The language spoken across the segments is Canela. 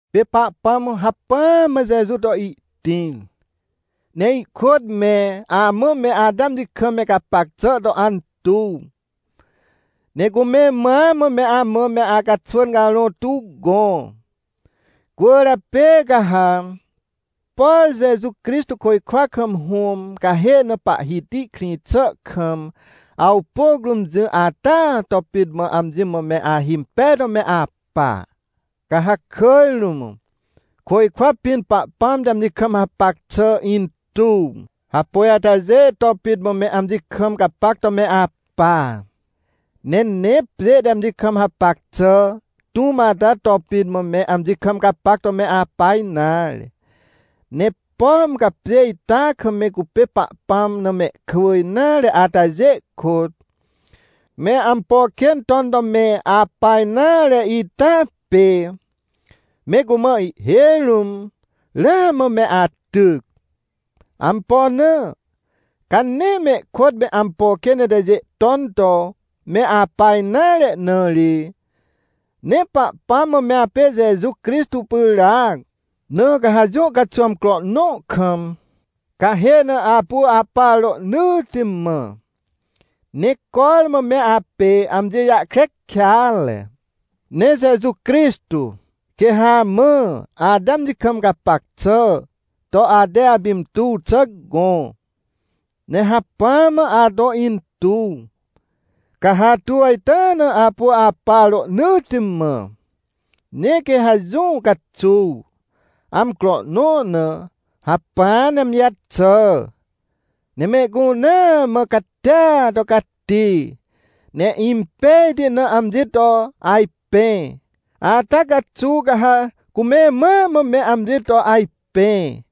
Pê Pahpãm hacpỹa mã Jeju to ihtĩr, ne ihkôt me amã me ate amji kam me gapac xà to antuw, ne cume mãa mã me amã me acaxwỳn carõ tuw gõ. Cwỳrjapê ca ha, por Jeju Crixtô côjkwa kam Hũm cahê na Pahhiti krĩ xà kam, awpôc rũm jỹ ata to pit mã, amji mã me ahimpej to me apa. Ca ha kỳj rũm, côjkwa pĩn Pahpãm te amji kam hapac xà intuw hapôj atajê to pit mã me amji kam gapac to me apa, ne nee pjê te amji kam hapac xà tũm ata to pit mã me amji kam gapac to me apa nare. Ne pom ca pjê ita kam me cupê Pahpãm na mehkwỳ nare atajê kôt, me ampo kên ton to me apa nare ita pê, me cumã ihhêj rũm, ramã me atyc. Ampo na? Ca nee mehkôt me ampo kên itajê ton to me apa nare na ri. Ne Pahpãm mã me apê Jeju Crixtô pyràac, na ca ha jũ caxuw amcro nõ kam, cahê na apu apa rohnỳtti mã, ne cormã me apê amji jahkre kêatre. Ne Jeju Crixtô quê ha amã ate amji kam gapac xà to ate apintuw xà gõ, ne hacpỹa mã ato intuw, ca ha atuw ita na apu apa rohnỳtti mã. Ne quê ha jũ caxuw, amcro nõ na, hacpỹ ne amji jaxà, ne mehcunea mã catia to cati, ne impejti na amji to ajpẽ. Ata caxuw ca ha cume mãa mã me amji to ajpẽ,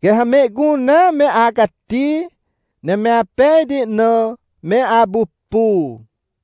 quê ha mehcunea me acati, ne me apejti na me apupu.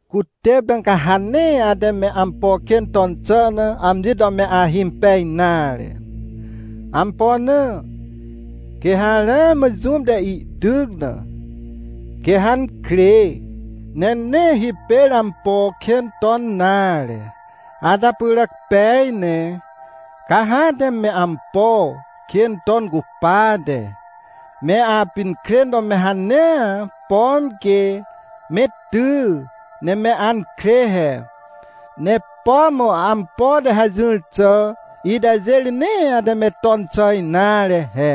Cutêp ca ha nee ate me ampo kên ton xà na amji to me ahimpej nare. Ampo na? Quê ha ramã jũm te ihtyc na, quê ha ankrê, ne nee hipêr ampo kên ton nare. Ata pyràc pej ne, ca ha ate me ampo kên ton cupate, me apinkrên to me hanea, pom quê me ty ne me ankrê he. Ne pom ampo te hajỹr xà itajê ri nee ate me ton xà nare he: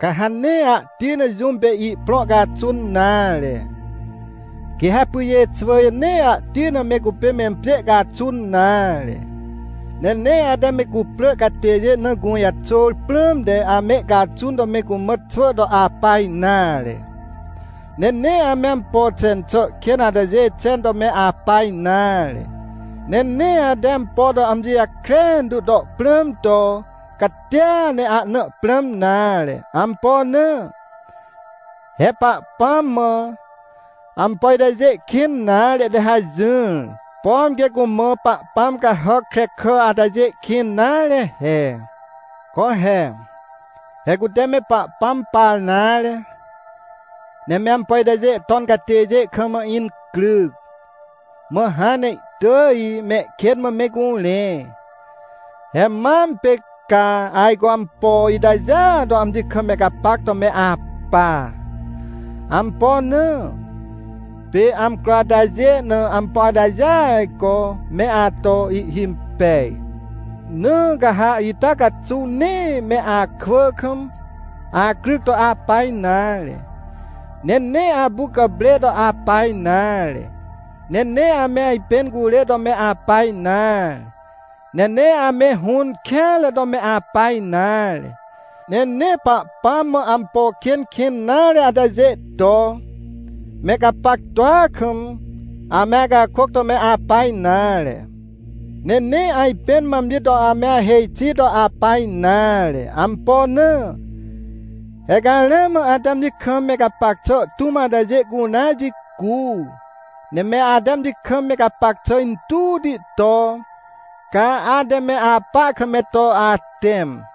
Ca ha nee ahti na jũm pê ihprõ caxun nare, quê ha pyjê xwỳjê nee ahti na me cupê mempjê caxun nare. Ne nee ate me cuprỳ catêjê na gũjaxôr prãmte, ame caxun to me cumã xwỳ to apa nare. Ne nee ame ampo xen xà kên atajê xen to me apa nare. Ne nee ate ampo to amji jakren tu to prãm to catia ne ahna prãm nare. Ampo na? He Pahpãm mã, ampo itajê kĩn nare te hajỹr, pom quê cumã pahpãm cahàc krekà atajê kĩn nare he. Co he! He cute me Pahpãm par nare, ne me ampo itajê ton catêjê kam incryc, mã hãn ne ihtỳj mehkên mã me curẽ. He mam pê ca ajco ampo itajêa to amji kam me gapac to me apa. Ampo na? Pê amcro atajê na ampo atajêa ajco me ato ihhimpej. Na ca ha ita caxuw nee me akwỳ kam acryc to apa nare. Ne nee apu gàprê to apa nare. Ne nee ame ajpẽn curê to me apa nare. Ne nee ame hũn kêanre to me apa nare. Ne nee Pahpãm mã ampo kên kĩn nare atajê to, me gapactua kam, ame acakôc to me apa nare. Ne nee ajpẽn mã amji to ame ahêj xi to apa nare. Ampo na? He ca ramã ate amji kam me gapac xà tũm atajê cunea jicu, ne me ate amji kam me gapac xà intuwti to, ca ate me apa kam me to atẽm.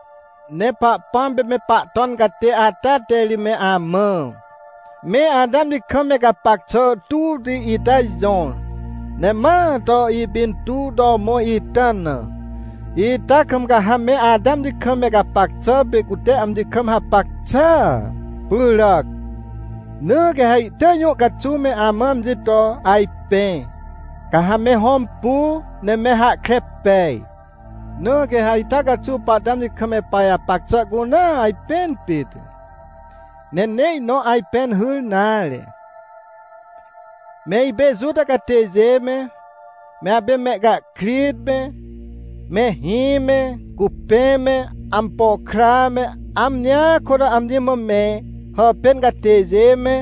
Ne Pahpãm pê me Pahton catê ata te ri me amã, me ate amji kam me gapac xà tuwti ita jõr, ne ma to ipintuw to mõr ita na, ita kam ca ha me ate amji kam me gapac xà pê cute amji kam hapac xàa pyràc. Na quê ha ihtỳj jũ caxuw me amã amji to ajpẽ, ca ha me hõmpu ne me hahkre pej. Na quê ha ita caxuw pahte amji kam me pajapac xà cunea ajpẽn pit, ne nee ihnõ ajpẽn hyr nare. Me ipê Juta catêjê me, me apê mehcahkrit me, mehĩ me, cupẽ me, ampo kra me, amjia kôt amji mã me hàpên catêjê me,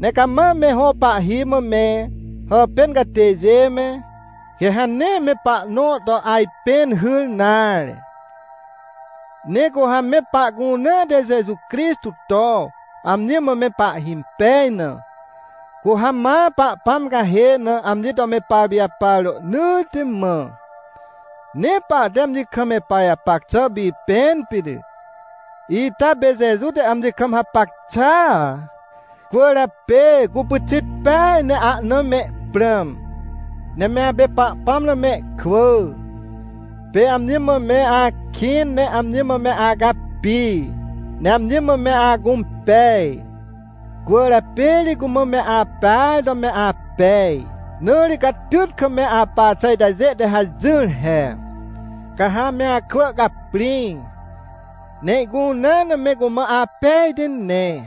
ne cama me hõ pahhi mã me hàpên catêjê me, quê ha nee me pahnõ to ajpẽn hyr nare. Ne cu ha me pahcunea te Jeju Crixtô to amji mã me pahhimpej na, cu ha ma Pahpãm cahê na amji to me papijapar rohnỳtti mã. Ne pahte amji kam me pajapac xà pipẽn pit, ita pê Jeju te amji kam hapac xàa. Cwỳrjapê cu pyxit peaj ne ahna me prãm. Ne me apê Pahpãm na mehkwỳ. Pê amji mã me akĩn ne amji mã me acapi, ne amji mã me acũmpej, cwỳrjapê ri cumã me apeaj to me apej. Na ri catyt kam me apa xà itajê te hajỹr he: Ca ha ame akwỳ caprĩ, ne ihcunea na me cumã apejti ne,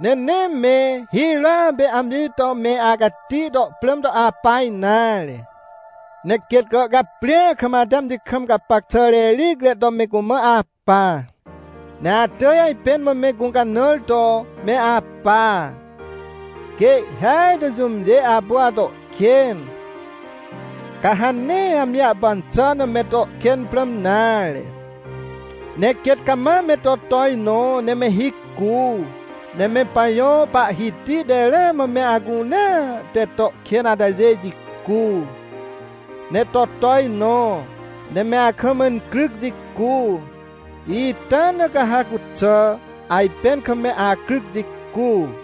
ne nee me hirôa pê amji to me acati to prãm to apa nare. Ne quêt gàhcaprĩa kam ate amji kam gapac xà rericre to me cumã apa. Ne atỳj ajpẽn mã me gũcanãr to me apa. Quê ihhêaj to jũmjê apu ato kên, ca ha nee amji jahpan xà na me to kên prãm nare, ne quêt cama me to tojnõ ne me hicu. Ne me pajõ Pahhiti te ramã me acunea te to kên atajê jicu, ne to tojnõ, ne me akam incryc jicu, ita na ca ha cuxà ajpẽn kam me acryc jicu.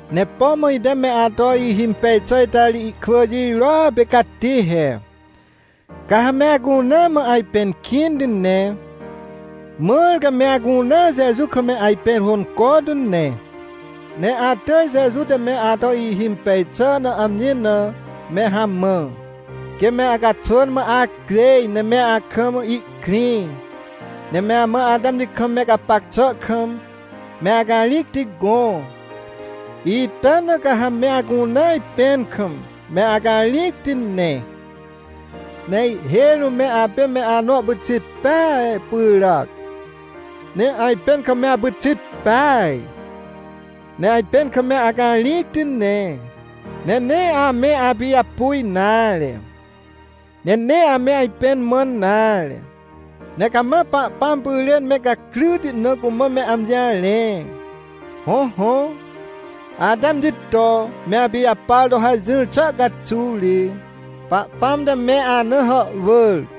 Ne pom ite me ato ihimpej xà ita ri ihkwỳ jirôa pê cati he: Ca ha me acunea mã ajpẽn kĩnti ne, mãr ca me acunea Jeju kam me ajpẽn hônco tu ne. Ne atỳj, Jeju te me ato ihhimpej xà na, amji na me hamã, quê me acaxwỳn mã acjêj ne me akam ihkrĩ, ne me amã ate amji kam me gapac xà kam me acarĩcti gõ. Ita na ca ha me acunea ajpẽn kam me acarĩcti ne. Ne ihhêj rũm me apê me anõ pyxit peaj pyràc, ne ajpẽn kam me apyxit peaj, ne ajpẽn kam me acarĩcti ne, ne nee ame apijapu nare, ne nee ame ajpẽn mãn nare. Ne cama Pahpãm pyrên me gakryti na cumã me amji jarẽ. Hõhõ, ate amji to me apijapar to hajỹr xà caxuw ri, Pahpãm te me ana hàhwỳr.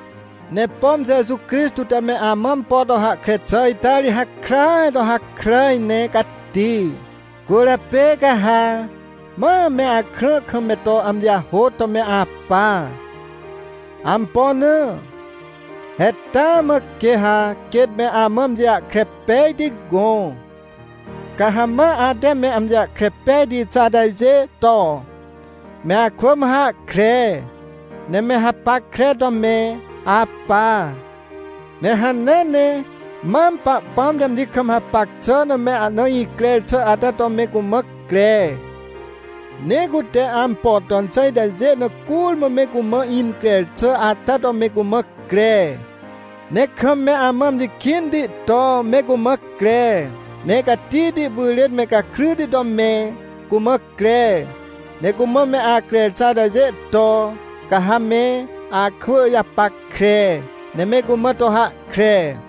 Ne pom Jeju Crixtô te me amã ampo to hahkre xà ita ri hakràaj to hakràj ne cati, cwỳrjapê ca ha ma me akrã kam me to amji jahôt to me apa. Ampo na? He taa mã quê ha quêt me amã amji jahkre pejti gõ. Ca ha ma ate me amji jahkre pejti xà atajê to, me akwỳ mã hahkre, ne me hapackre to me apa. Ne hanea ne mam Pahpãm te amji kam hapac xà na me ahna increr xà ata to me cumã cre, ne cute ampo ton xà itajê na curmã me cumã increr xà ata to me cumã cre. Ne kam me amã amji kĩnti to me cumã cre, ne catihti pyrên me gakryti to me cumã cre. Ne cumã me acrer xà atajê to, ca ha me akwỳ japackre, ne me cumã to hahkre.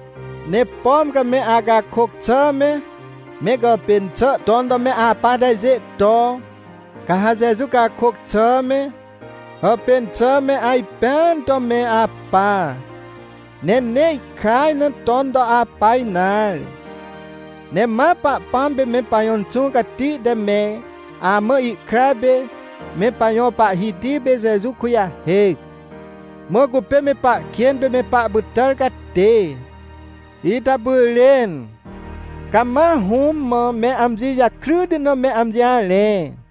Ne pom ca me acakôc xà me, me gàpên xà ton to me apa atajê to, ca ha Jeju cakôc xà me, hàpên xà me ajpẽan to me apa, ne nee ihkaj na ton to apa nare. Ne ma Pahpãm pê me pajõ Inxũ Cati te me amã ihkra pê me pajõ Pahhiti pê Jeju kujahêc, mã cupê me pahkên pê me pahpytàr catê, ita pyrên, ca ma Hũm mã me amji jakryti na me amji jarẽ.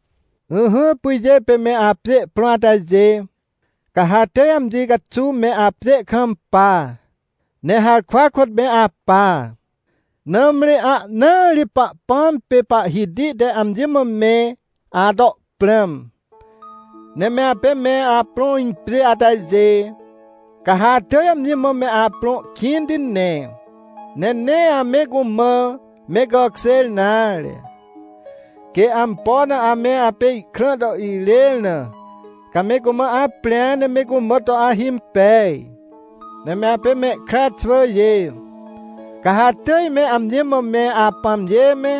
Ỹhỹ, pyjê pê me apjê prõ atajê, ca ha atỳj amji caxuw me apjê kampa, ne harkwa kôt me apa. Nãmri ahnaa ri Pahpãm pê Pahhiti te amji mã me ato prãm. Ne me apê me aprõ impjê atajê, ca ha atỳj amji mã me aprõ kĩnti ne. Ne nee ame cumã me gàkjêr nare, quê ampo na ame apê ihkrã to irêr na, ca me cumã aprĩa ne me cumã to ahimpej. Ne me apê mehkra xwỳjê, ca ha atỳj me amji mã me apãmjê me,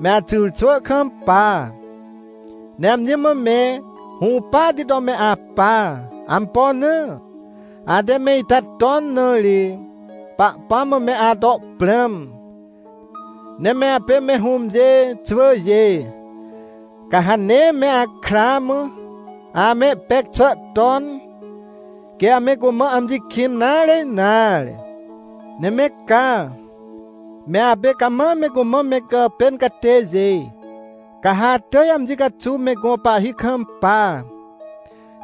me axyrxwỳ kampa, ne amji mã me hũpahti to me apa. Ampo na? Ate me ita ton na ri Pahpãm mã me ato prãm. Ne me apê me hũmjê xwỳjê, ca ha nee me akra mã amehpec xà ton, quê ame cumã amji kĩn nare nare. Ne me ca, me apê cama me cumã me gàpên catêjê, ca ha atỳj amji caxuw me gõ pahhi kampa.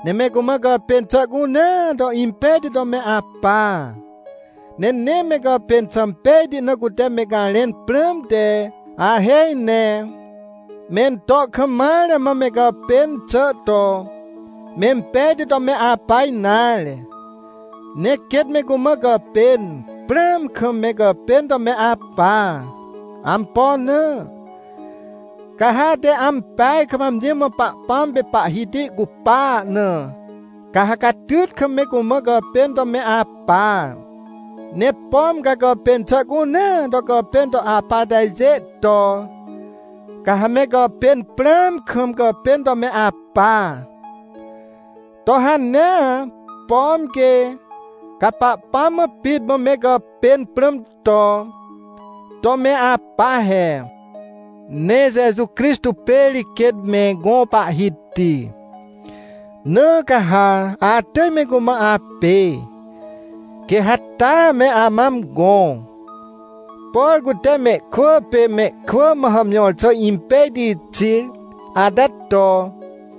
Ne me cumã gàpên xà cunea to impejti to me apa. Ne nee me gàpên xà pejti na cute me garẽn prãmte ahêj ne, mento kam mare mã me gàpên xà to mempejti to me apa nare. Ne quêt me cumã gàpên prãam kam me gàpên to me apa. Ampo na? Ca ha ate ampeaj kam amji mã Pahpãm pê Pahhiti cupa na, ca ha catyt kam me cumã gàpên to me apa. Ne pom ca gàpên xà cunea to gàpên to apa atajê to, ca ha me gàpên prãam kam gàpên to me apa, to hanea, pom quê, ca Pahpãm mã pit mã me gàpên prãm to, to me apa he. Ne Jeju Crixtô pê ri quêt me gõ Pahhiti, na ca ha atỳj me cumã apê, quê ha taa me amã amgõ, por cute mehkwỳ pê mehkwỳ mã hàmjõr xà impejti xir ata to.